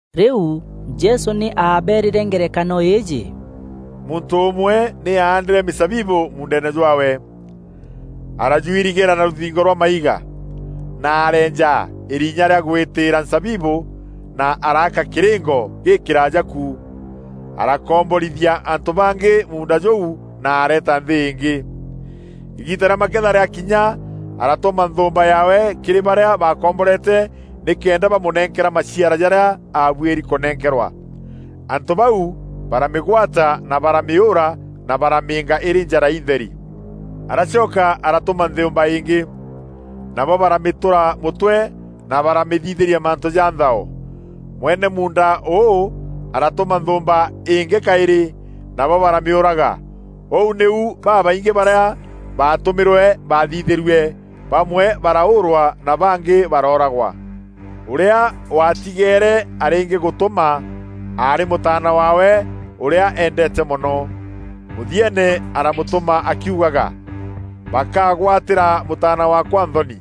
Rîu Jesû nî aabeerîre ngerekano îîjî, “Muntû ûmwe nî aandîre mîzabibû muundeene jwaawe. Arajuirigîra na rûthingo rwa maiga, na areenja îrinya rîa gwitîîra nzabibû, na araaka kîrîngo gîkîraaja kû. Arakomborithia antû bangî muunda jûu na areeta nthî îngî. Îgiita rîa maketha rîakinya, aratûma nthûûmba yaawe kîrî barîa bakomborete nîkenda bamûnenkera maciara jarîa abuîri kûnenkerwa. Antû bau baramîgwata na baramîûûra na baramîînga îrî njara intheri. Aracoka aratûma nthûûmba îngî. Nabo baramîtûra mûtwe na baramîthithîria mantû ja nthao. Mwene muunda û aratûma nthûûmba îngî kaîrî, nabo baramîûraga. Ûu nîu babaingî barîa baatûmîrwe baathithîîrue, bamwe baraûûrwa na bangî barooragwa. Ûrîa waatigeere arîngîgûtûma, aarî mûtaana waawe ûrîa eendeete mono. Mûthieene aramûtûma akiugaga, ‘Bakagwatîra mûtaana waakwa nthoni.’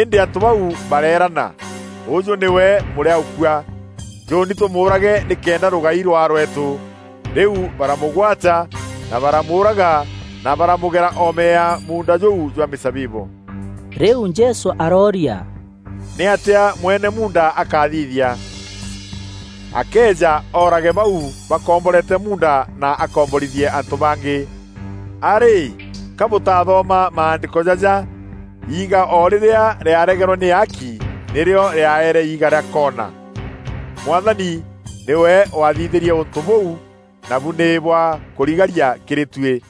Îndî antû bau bareerana, ‘Ûjû nîwe mûrîaûkua, njûûni tûmûûrage nîkenda rûgai rwaa rweetû.’” Rîu baramûgwata na baramûûraga na baramûgera oome ya muunda jûu jwa mîzabibû. Rîu Jesû arooria, “Nîatîa mwene muunda akathithia? Akeeja, oorage bau bakomborete muunda na akomborithie antû bangî. A rîî, ka bûtathoma maandîko jaja: ‘Iiga o rîrîa rîaregerwe nî aaki, nîrîo rîaeere iiga rîa koona. Mwathani nîwe wathithîrie ûntû bûu, nabu nî bwa kûrigaria kîrî tuî!’”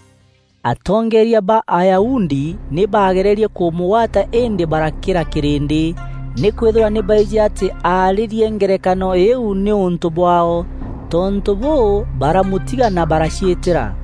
Atongeeria ba Ayahudi nî baagererie kûmûgwata îndî barakîra kîrîndî. Nîkwîthîrwa nî baijî atî aarîrie ngerekano îîu nîûntû bwaao. Tontû bûû, baramûtiga na baraciîtîra.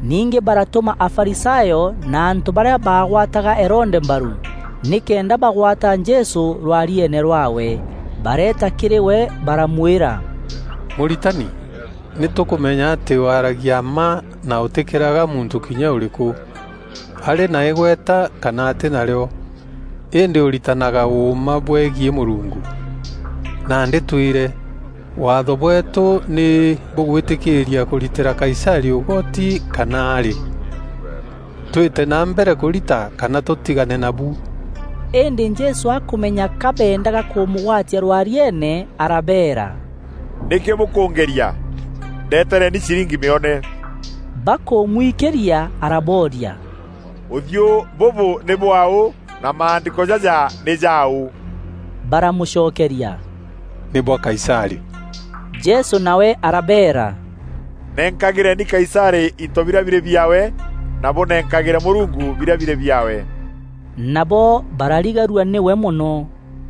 Ningî baratûma Afarisayo na antû barîa baagwataga Herode mbaru, nîkenda bagwata Jesû rwarieene rwaawe. Bareeta kîrî we, baramwîra, “Mûritani, nî tûkûmenya atî waragia mma na ûtîkîraga muntû kinya ûrîkû, arî na îgweta kana atî na rîo, îndî ûritanaga ûûma bwegiî Mûrungu. Nandî twîre, Waatho bweetû nî bûgwîtîkîîria kûritîra Kaisarî ûgoti kana arî? Twîte na mbere kûrita kana tûtigane nabu?” Îndî Jesû akûmenya ka beendaga kûmûgwatia rwariiene arabeera, “Nîkî bûkûngeria? Ndetereni ciringi mîone.” Bakûmwikîria, arabooria, “Ûthiû bûbû nî bwaaû na maandîko jaja nî jaaû?” Baramûcokeria, “Nî bwa Kaisarî.” Jesû nawe arabeera, “Nenkagîreni Kaisarî into birîa birî biaawe, na bûnenkagîre Mûrungu birîa birî biaawe.” Nabo bararigarua nîwe mono.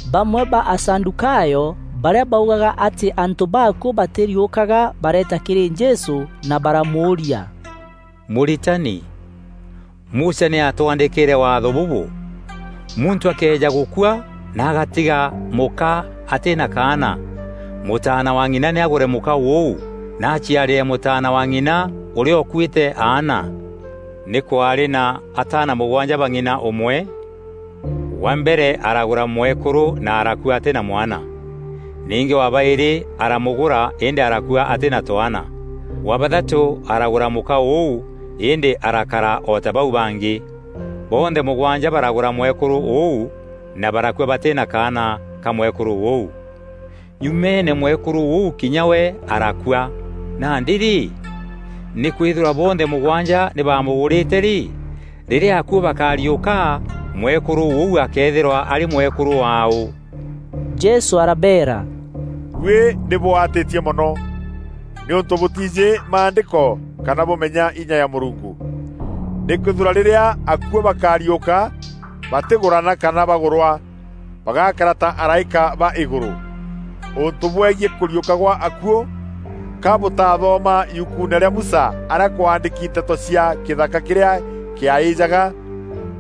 Bamwe ba Asadûkayo, barîa baugaga atî antû baakuû batîriûkaga bareeta kîrî Jesû na baramûûria, “Mûritani, Musa nî aatwandîkîîre Waatho bûbû: ‘Muntû akëeja gûkua na agatiga mûka atî na kaana, mûtaana wa ng'ina nî agûre mûka ûu, na aciarîre mûtaana wa ng'ina ûrîa ûkuîte aana.’ Nî kwaarî na ataana mûgwanja ba ng'ina ûmwe. Wa mbere aragûra mwekûrû na arakua atî na mwana. Ningî wa baîrî aramûgûra îndî arakua atî na twaana. Wa bathatû aragûra mûka ûu îndî arakara o ta bau bangî. Bonthe mûgwanja baragûra mwekûrû ûu na barakua batî na kaana ka mwekûrû ûu. Nyumeene mwekûrû ûu kinya we arakua. Nandî rî, nîkwîthîrwa bonthe mûgwanja nî baamûgûrîte rî, rîrîa akuû bakariûka, mwekûrû ûu akeethîrwa arî mwekûrû waaû?” Jesû arabeera, “Buî nî bûatîtie mono, nîûntû bûtiijî maandîko kana bûmenya inya ya Mûrungu. Nîkwîthîrwa rîrîa akuû bakariûka, batîgûrana kana bagûrwa. Bagakara ta araîka ba îgûrû. Ûntû bwegiî kûriûka gwa akuû, ka bûtaathoma yukuune rîa Musa arîa kwaandîki nteto cia kîthaka kîrîa kîaîjaga?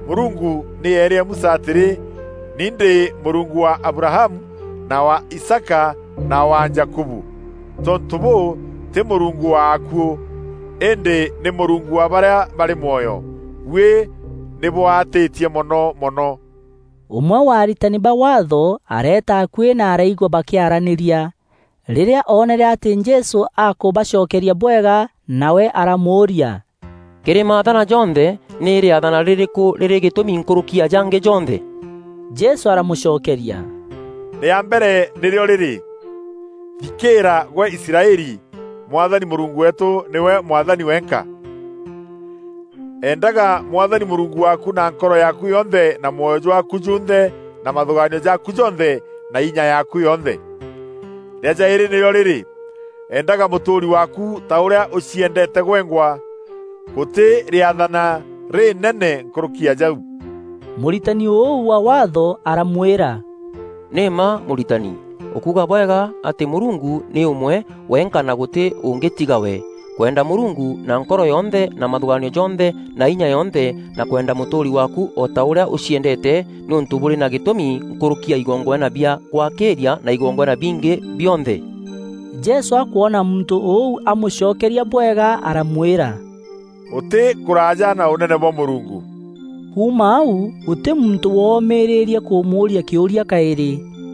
Mûrungu nî eerîre Musa atîrî, ‘Nî ndî Mûrungu wa Abrahamu, na wa Isaaka, na wa Jakubu.’ Tontû bûû, tî Mûrungu wa akuû, îndî nî Mûrungu wa barîa barî mwoyo. Buî nî bûatîtie mono mono.” Ûmwe wa aritani ba Waatho areeta akuî na araigua bakîaranîria. Rîrîa oonere atî Jesû akûbacokeria bwega, nawe aramûûria, “Kîrî maathana jonthe, nî rîathana rîrîkû rîrî gîtûmî nkûrûki ya jangî jonthe?” Jesû aramûcokeria, “Rîa mbere nîrîo rîrî: ‘Thikîîra gwe Israeli! Mwathani Mûrungu weetû nîwe Mwathani wenka. Endaga Mwathani Mûrungu waaku na nkoro yaaku yonthe na mwoyo jwaaku junthe na mathûgaanio jaaku jonthe na inya yaaku yonthe.’ Rîa jaîrî nîrîo rîrî: ‘Endaga mûtûûri waaku ta ûrîa ûciendeete gwengwa!’ Gûtî rîathana rînene nkûrûki ya jau.” Mûritani ûu wa Waatho aramwîra, “Nî mma Mûritani! Ûkuuga bwega atî Mûrungu nî ûmwe wenka na gûtî ûngî tiga we. Kwenda Mûrungu na nkoro yonthe na mathûgaanio jonthe na inya yonthe na kwenda mûtûûri waakû o ta ûrîa ûciendeete nî ûntû bûrî na gîtûmi nkûrûki ya igongwana bia gwakîîria na igongwana bingî bionthe.” Jesû akwona muntû ûu amûcokeria bwega aramwîra, “Ûtî kûraaja na Ûnene bwa Mûrungu.” Kuuma au gûtî muntû womîrîîrîe kûmûûria kîûria kaîrî.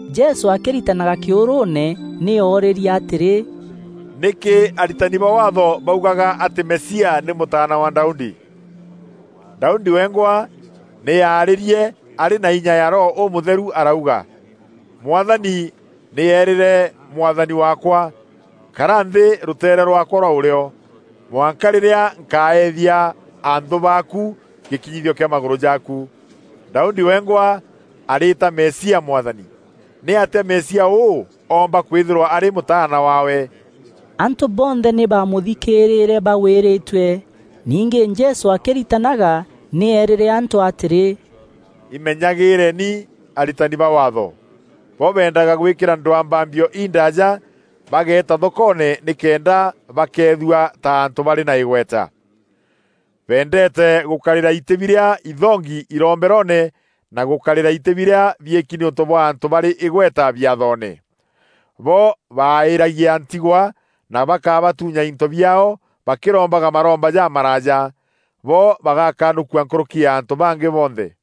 Jesû akîritanaga kîûrûûne nî oorîrie atîrî, “Nîkî aritani ba Waatho baugaga atî Mesia nî mûtaana wa Daudi? Daudi wengwa nî aarîrie arî na inya ya Roho Ûmûtheru arauga: ‘Mwathani nî eerîre Mwathani waakwa, kara nthî rûteere rwaakwa rwa ûrîo, mwanka rîrîa nkaethia anthû baaku, gîkinyithio kîa magûrû jaaku.’ Daudi wengwa arîîta Mesia Mwathani. Nîatîa Mesia ûu oomba kwîthîrwa arî mûtaana waawe?” Antû bonthe nî baamûthikîrîre bagwîrîtue. Ningî Jesû akîritanaga nî eerîre antû atîrî, “Imenyagîîreni aritani ba Waatho. Bo beendaga gwîkîra ndwambambio indaaja bageeta thokoone nîkenda bakeethua ta antû barî na îgweta. Beendeete gûkarîra itî birîa inthongi iromberoone na gûkarîra itî birîa biîki nîûntû bwa antû barî îgweta biathoone. Bo baaîîragia ntigwa na bakabatuunya into biaao bakîrombaga maromba jamaraaja. Bo bagaakanûkua nkûrûki ya antû bangî bonthe.”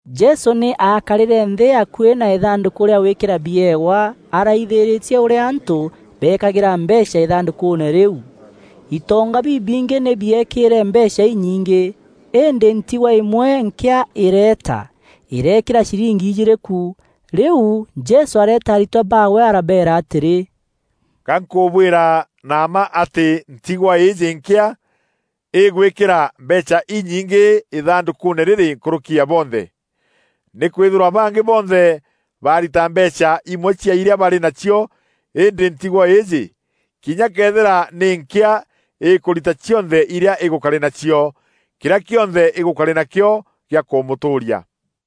Jesû nî aakarîre nthî akuî na Îthandûkû rîa gwîkîra biewa araithîrîtie ûrîa antû beekagîra mbeecha îthandûkûûne rîu. Itonga bibingî nî biekîîre mbeecha inyingî. Îndî ntigwa îmwe nkîa îreeta, îreekîra ciringî ijîîrî ku. Rîu Jesû areeta aritwa baawe arabeera atîrî, “Ga nkûbwîra na mma atî ntigwa îîjî nkîa, îgwîkîra mbeecha inyingî îthandûkûûne rîrî nkûrûki ya bonthe. Nîkwîthîrwa bangî bonthe barita mbeecha imwe cia irîa barî nacio îndî ntigwa îîjî, kinya këethîra nî nkîa îkûrita cionthe irîa îgûkarî nacio, kîrîa kîonthe îgûkarî nakîo gîa kûmûtûûria.”